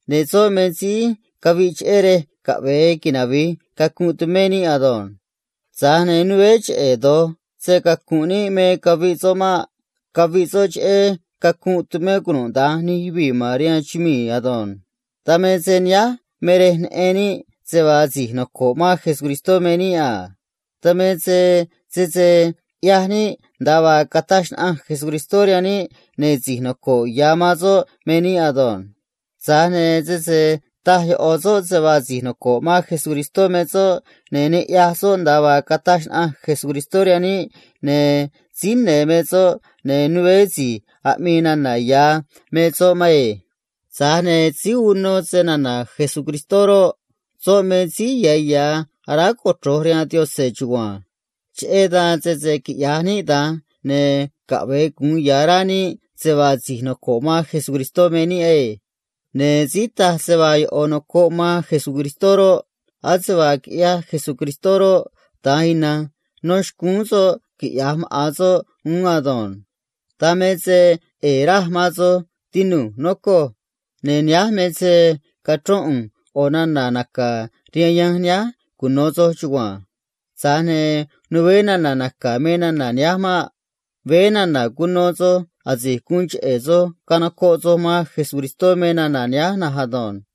Ne̱ soꞌ me síí caviꞌ cheꞌé rej caꞌve̱e navi̱j cacunꞌ tumé níꞌ ado̱nj. Tza̱j ne̱ né cheꞌe̱ ma̱an do̱j se‑cacu̱nꞌ níꞌ me caviꞌ soꞌ maꞌ. Caviꞌ soꞌ cheꞌé cacunꞌ tumé cunuda̱nj nij yuvii̱ ma̱n rihaan chumii̱ ado̱nj. Dan me se nihánj me rej neꞌen níꞌ se vaa si̱j noco̱ꞌ man Cristó me níꞌ a. Dan me se sese uno níꞌ suun caꞌneꞌ Jesucristó rihaan níꞌ, ne̱ si̱j noco̱ꞌ ya̱ man soꞌ me níꞌ ado̱nj. Tza̱j ne̱ sese taj ꞌo̱ soꞌ se vaa si̱j noco̱ꞌ man Cristó me soꞌ ne̱ ne uno soꞌ suun caꞌneꞌ Cristó rihaan níꞌ, ne̱ síí ne̱ me soꞌ, ne̱ né si̱j aꞌmii nana̱ ya̱ me soꞌ maꞌ. Tza̱j ne̱ síí uno snana̱ Cristó roꞌ, soꞌ me síí ya̱ ya̱ aráj cochro̱j rihaan Yaꞌanj chugua̱nj. Cheꞌé dan, sese quiꞌya̱j níꞌ da̱nj, ne̱ caꞌve̱e gu̱un ya̱ rá níꞌ se vaa si̱j noco̱ꞌ man Cristó me níꞌ ado̱nj. Ne̱ síí taj se vaa ꞌo̱ nocoꞌ soꞌ man Cristó roꞌ, ase vaa quiꞌyaj Jesús, da̱nj ina̱nj nó xcúún soꞌ quiꞌya̱j maꞌa̱n soꞌ uún ado̱nj. Dan me se ꞌe̱e̱ raj man soj, tinu̱j, nocoj. Ne̱ nihánj me se cachro̱n ꞌu̱nj cheꞌé ꞌo̱ suun aꞌnéꞌ ꞌu̱nj rihaan soj cuno̱ soj chugua̱nj. Tza̱j ne̱ né su̱u̱n aꞌneꞌ naca̱ ꞌu̱nj rihaan soj me nana̱ nihánj maꞌ. Veé nana̱ cuno soj asi̱j guun cheꞌe̱ soj canocoꞌ soj man Cristó me nana̱ nihánj na̱nj ado̱nj.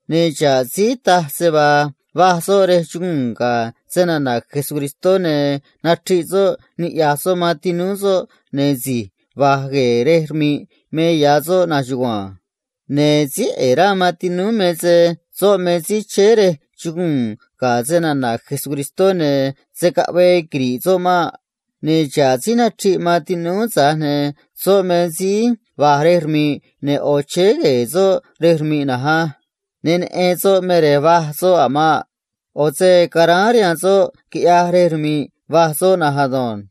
Ne̱ xa̱ꞌ síí taj se vaa va̱j soꞌ rej chuguu̱n ga̱ snana̱ Cristó ne̱ nachriꞌ soꞌ niꞌya̱j soꞌ man tinúú soꞌ, ne̱ si̱j va̱j gue̱e̱ rej rmi̱ꞌ me ya̱ soꞌ na̱nj chugua̱nj. Ne̱ síí ꞌe̱e̱ rá man tinúú me se soꞌ me síí chéé rej chuguu̱n ga̱ snana̱ Cristó, ne̱ se̱ caꞌvee naxru̱ꞌ soꞌ maꞌ. Ne̱ xa̱ꞌ síí nachriꞌ man tinúú, tza̱j ne̱ soꞌ me síí va̱j rej rmi̱ꞌ, ne̱ ꞌo̱ chéé gue̱e̱ soꞌ rej rmi̱ꞌ na̱nj á. Ne neꞌen soꞌ me rej va̱j soꞌ a̱ maꞌ. ꞌO̱ se caráán rihaan soꞌ, quiꞌyaj rej rmi̱ꞌ va̱j soꞌ na̱nj ado̱nj.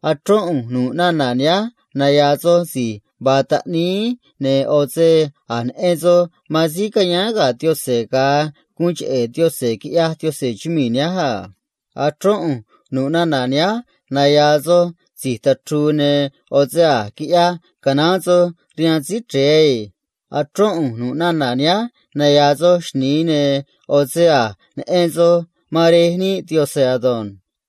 Achrón ꞌu̱nj nu̱ꞌ nana̱ nihánj naya̱a̱ soj si̱j vaa taꞌníí, cheꞌé se a̱j neꞌen soj man síí cayáán ga̱ Yaꞌanj asi̱j tacóó chumii̱ a. Achrón ꞌu̱nj nu̱ꞌ nana̱ nihánj naya̱a̱ soj si̱j tachru̱u̱, cheꞌé se a̱j quiꞌyaj canaán soj rihaan Síí Chre̱e ado̱nj. Achrón ꞌu̱nj nu̱ꞌ nana̱ nihánj naya̱a̱ soj xni̱i, cheꞌé se a̱j neꞌen soj man Rej níꞌ Yaꞌanj ado̱nj.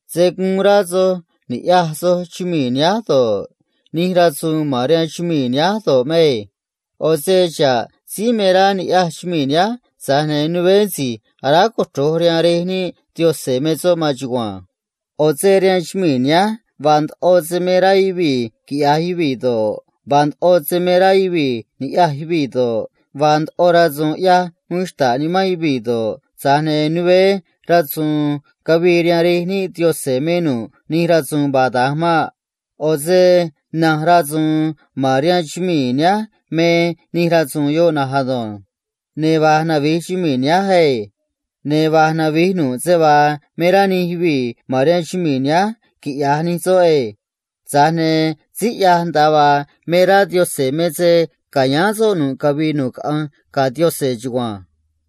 Se̱ guun rá soj ni̱ꞌyaj soj chumii̱ nihánj do̱ꞌ, nij rasu̱u̱n ma̱n rihaan chumii̱ nihánj do̱ꞌ maꞌ. ꞌO̱ se xa̱ꞌ síí me rá niꞌya̱j chumii̱ nihánj, tza̱j ne̱ né si̱j aráj cochro̱j man Rej níꞌ Yaꞌanj me soꞌ maan chugua̱nj. ꞌO̱ se rihaan chumii̱ nihánj vaa ndoꞌo se me rá nee̱ man yuvii̱ quiꞌya̱j yoꞌ do̱ꞌ, vaa ndoꞌo se me rá yuvii̱ ni̱ꞌyaj yuvii̱ do̱ꞌ, vaa ndoꞌo rasu̱u̱n ꞌyaj uun xta̱ꞌ nimán yuvii̱ do̱ꞌ, tza̱j ne̱ né ra̱su̱u̱n cavii rihaan Rej níꞌ Yaꞌanj me nu̱ꞌ nij rasu̱u̱n vaa da̱nj maꞌ. ꞌO̱ se na̱nj rasu̱u̱n ma̱n rihaan chumii̱ nihánj me nij rasu̱u̱n yoꞌ na̱nj ado̱nj. Ne̱ va̱j navi̱j chumii̱ nihánj ado̱nj. Ne̱ va̱j navi̱j nu̱ꞌ se vaa me rá nij yuvii̱ ma̱n rihaan chumii̱ nihánj quiꞌya̱j nij soꞌ na̱nj ado̱nj. Tza̱j ne̱ síí ꞌyaj nda̱a vaa me rá Yaꞌanj me se ca̱yáán soꞌ nu̱ꞌ cavii nu̱ꞌ caꞌanj ga̱ Yaꞌanj chugua̱nj.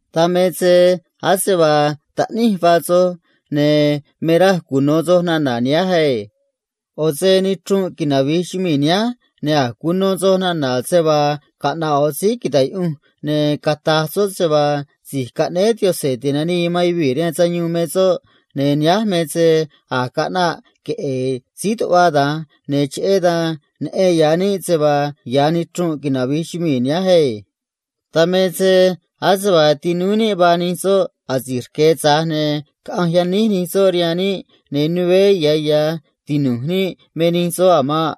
Dan me se ase vaa taꞌníj vaa soj, ne̱ me raj cuno̱ soj nana̱ nihánj ado̱nj. ꞌO̱ se nichrunꞌ navi̱j güii man níꞌ, ne̱ a̱j cuno soj nana̱ se vaa caꞌna̱ꞌ maꞌa̱n síí ta̱j riꞌyunj man Cristó, ne̱ cata̱j soꞌ se vaa Si̱j Caꞌnéé Yaꞌanj Ti̱nanii man Yuvii̱ rihaan Sayuun me soꞌ, ne̱ nihánj me se a̱j caꞌnaꞌ queꞌe̱e̱ síí ta̱j riꞌyunj man Cristó, ne̱ cheꞌé dan neꞌen ya̱ níꞌ se vaa ya̱ nichrunꞌ navi̱j güii man níꞌ ado̱nj. Dan me se ase vaa tinúú níꞌ vaa nij soꞌ asi̱j rque̱, tza̱j ne̱ caꞌanj yaníj nij soꞌ rihaan níꞌ, ne̱ né ya̱ ya̱ tinu̱j níꞌ me nij soꞌ a̱ maꞌ.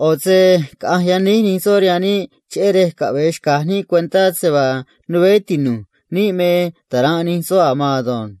ꞌO̱ se caꞌanj yaníj nij soꞌ rihaan níꞌ cheꞌé rej caꞌve̱e xca̱j níꞌ cuentá se vaa né tinu̱j níꞌ me ta̱ranꞌ nij soꞌ a̱ maan ado̱nj.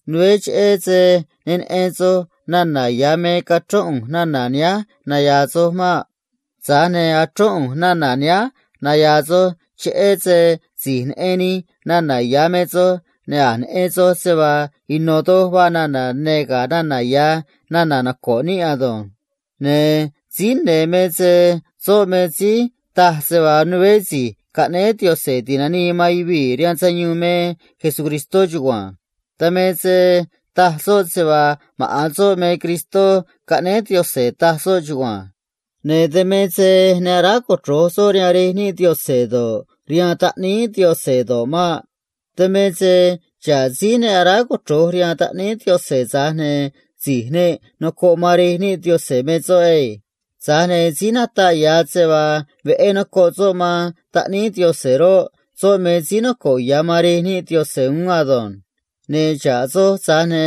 Né cheꞌe̱ se ne neꞌen soj nana̱ ya̱ me cachrón ꞌu̱nj nana̱ nihánj naya̱a̱ soj maꞌ. Tana̱nj achrón ꞌu̱nj nana̱ nihánj cheꞌé se si̱j neꞌen nij nana̱ ya̱ me soj, ne̱ a̱j neꞌen soj se vaa ino̱ doj vaa nana̱ ne̱ ga̱ nana̱ ya̱ nana̱ noco̱ꞌ níꞌ ado̱nj. Ne̱ síí ne̱ me se soꞌ me síí taj se vaa né Si̱j Caꞌnéé Yaꞌanj Ti̱nanii man Yuvii̱ rihaan Sayuun me Jesús chugua̱nj. Dan me se síí ta̱j riꞌyunj man Cristó me soꞌ chugua̱nj. Ne̱ dan me se ne aráj cochro̱j soꞌ rihaan Rej níꞌ Yaꞌanj do̱ꞌ, rihaan Taꞌníí Yaꞌanj do̱ꞌ maꞌ. Dan me se xa̱ꞌ síí ne aráj cochro̱j rihaan Taꞌníí Yaꞌanj, tza̱j ne̱ si̱j ne nocoꞌ man Rej níꞌ Yaꞌanj me soꞌ ado̱nj. Tza̱j ne̱ síí nataꞌ ya̱ se vaa veꞌé nocoꞌ soꞌ man Taꞌníí Yaꞌanj roꞌ, soꞌ me síí noco̱ꞌ ya̱ man Rej níꞌ Yaꞌanj uún ado̱nj. Ne̱ xa̱ꞌ soj, tza̱j ne̱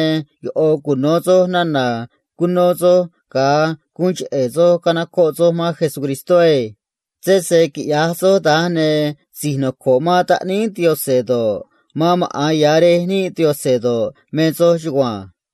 ꞌo̱ cuno̱ soj nana̱ cuno soj ga̱a guun cheꞌe̱ soj canocoꞌ soj man Cristó á. Sese quiꞌya̱j soj da̱nj, ne̱ si̱j noco̱ꞌ ya̱ man Taꞌníí Yaꞌanj do̱ꞌ, man maꞌa̱n Rej níꞌ Yaꞌanj do̱ꞌ, me soj chugua̱nj.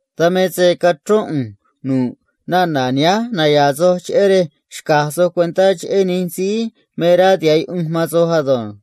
Dan me se cachrón ꞌu̱nj nu̱ꞌ nana̱ nihánj naya̱a̱ soj cheꞌé rej xca̱j soj cuentá cheꞌé nij síí me rá tiha̱ꞌ yuꞌunj man soj ado̱nj.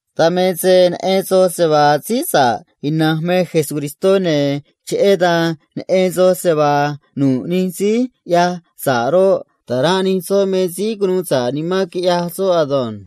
Dan me se neꞌen soj se vaa síí sa̱ꞌ ina̱nj me Cristó, ne̱ cheꞌé dan neꞌen soj se vaa nu̱ꞌ nij síí ꞌyaj sa̱ꞌ roꞌ, ta̱ranꞌ nij soꞌ me síí cunuu sa̱ꞌ nimán quiꞌyaj soꞌ ado̱nj.